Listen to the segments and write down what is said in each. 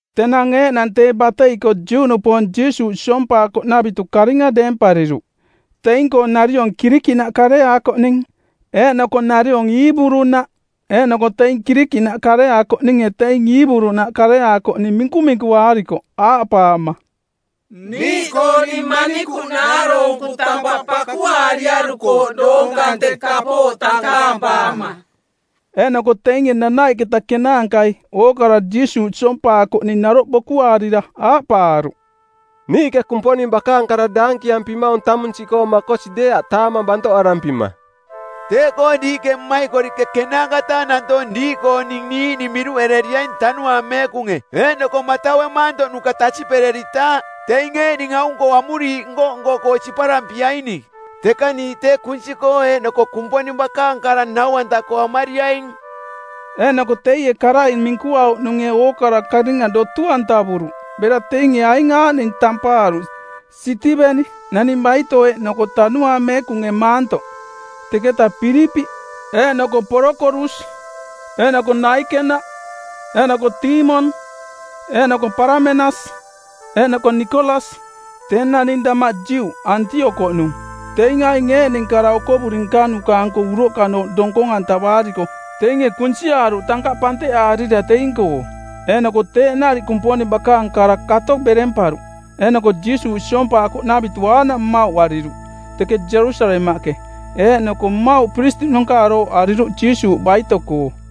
Tenang eeꞌnang tee batei-koo Juꞌnupoong Jiisuuꞌ siompaakoꞌnavitu karinga deempariruꞌ, teing-koo nariong Kirikiꞌnaꞌ kareaakoꞌning eeꞌnoko nariong Iiburu-naꞌ, eeꞌnoko teing Kirikiꞌnaꞌ kareaakoꞌninge teing Iiburu-naꞌ kareaakoꞌning minkuminkuaarikoꞌ aaꞌpaama, “Niiꞌkooning manikuꞌ naaroonku tampaꞌ pakuaariarukooꞌ doong kante kapooꞌ tankaampaama.” Eeꞌnoko teinge nanaiꞌketa kenaankai ookara Jiisuuꞌ siompaakoꞌning naroꞌ bokuaarira aaꞌpaaruꞌ, “Niiꞌke Kumponing bakaang kara daankiampimaung tamung siꞌkoo makosi deeaꞌ taamang bantoꞌarampima. Teeꞌkoo diiꞌke mmaikoriꞌke ˜kenaanka-taa nantoong diiꞌkooning niiꞌning miruꞌereriaing Tanuaang Meekunge eeꞌnoko mataue maantoꞌnuka tasiꞌpereritaaꞌ, teing eeꞌning aung-koo amuriiꞌ nko-nko-koo siparampiaining. Teka niiꞌ tee kunsi-koo eeꞌnoko Kumponing bakaang kara nau-anta-koo amariaing.” Eeꞌnoko teie karai minkuauꞌnunge ookara karinga dotu-antavuruꞌ, bera teinge aing aaꞌning tampaaruꞌ: Sitiveni, naning baito eeꞌnoko Tanuaang Meekunge maantoꞌ, teketa Pilipiꞌ, eeꞌnoko Porokorus, eeꞌnoko Naikena, eeꞌnoko Tiimon, eeꞌnoko Paramenas, eeꞌnoko Nikolas, tee naning damaꞌ Juꞌ, Antiokoꞌnung. Teing aing eeꞌning kara okovuri nkanuka-anko uroꞌkanooꞌ donkong-antavaariko teinge kunsiaaruꞌ tankaꞌ panteꞌaarira teing-koo. Eeꞌnoko teeꞌ nariꞌ Kumponing bakaang kara kato beremparuꞌ eeꞌnoko Jiisuuꞌ siompaakoꞌnavitu aaꞌnaꞌ mmauꞌariruꞌ teke Jerusalemaꞌke, eeꞌnoko mmauꞌ piristiꞌnanka arooꞌariruꞌ Jiisuuꞌ baito-koo.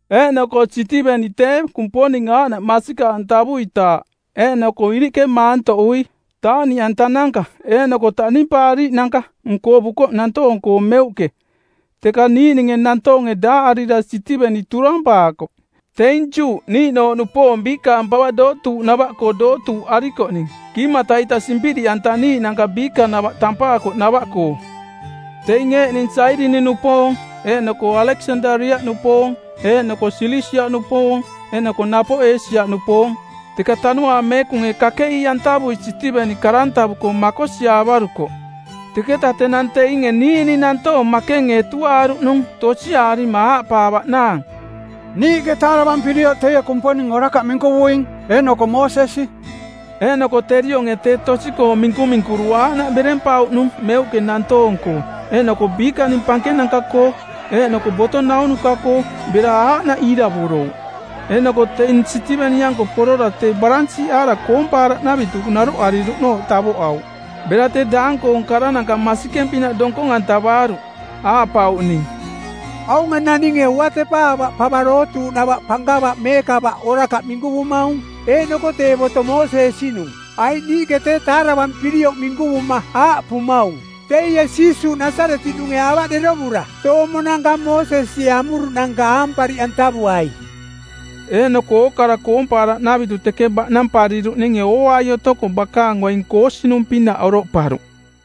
Eeꞌnoko Sitivenie tee, Kumponing aaꞌnaꞌ masikaꞌantavuitaaꞌ eeꞌnoko iriꞌke maantoꞌui taaꞌniꞌantananka eeꞌnoko taꞌnimpaariiꞌnanka nkovukoꞌ nantoong-koo meuꞌke. Teka niiꞌninge nantoonge daaꞌarira Sitiveni turampaakoꞌ. Teing Juꞌ niiꞌnooꞌnupoong biikaang pava dootuuꞌnava-koo dootuuꞌarikoꞌning Kiimata-ita Simpiriꞌantaniiꞌnanka Biikanava tampaakoꞌnava-koo. Teing eeꞌning Sairini-nupoong eeꞌnoko Aleksandaria-nupoong eeꞌnoko Silisia-nupoong eeꞌnoko napoꞌ Eesia-nupoong. Teka Tanuaang Meekunge kakeꞌii-antavui Sitiveni karantavuko˜ makosiaavarukoꞌ. Teketa tenang teinge niiꞌning nantoong makenge etuaaruꞌnung tosiarima aaꞌpaavaꞌnaang, “Niiꞌke taaravampirioꞌ teie Kumponing orakaꞌ minkuvuing, eeꞌnoko Moosesi.” Eeꞌnoko terionge tee tosi-koong minkuminkuru aaꞌnaꞌ berempauꞌnung meuꞌke nantoong-koo, eeꞌnoko biikaning pankenanka-koo eeꞌnoko boto naunuka-koo bera aaꞌnaꞌ iiravorouꞌ. Eeꞌnoko teing Sitiveni-anko porora tee baransiiꞌaara koompaaraꞌnavitu naroꞌariruꞌnooꞌ tavoꞌauꞌ. Bera tee daang-koong karananka masikeng-pinaꞌ donkong-antavaaruꞌ aaꞌpauꞌning, “Aunge naninge uatepa ava pava dootuuꞌnava pankava meekava orakaꞌ minkuvumaung eeꞌnoko tee boto Moosesi-nung. Aiꞌ niiꞌke tee taaravampirioꞌ minkuvuma aaꞌpumaung: Teie Jiisuuꞌ Nasaretiꞌnunge ava derovura toomonanka Moosesie amuruꞌnanka aampariꞌantavuai.” Eeꞌnoko ookara koompaaraꞌnavitu teke baꞌnampariruꞌninge ooai otoko bakaang oing koosinung˜pinaꞌ oroꞌparuꞌ.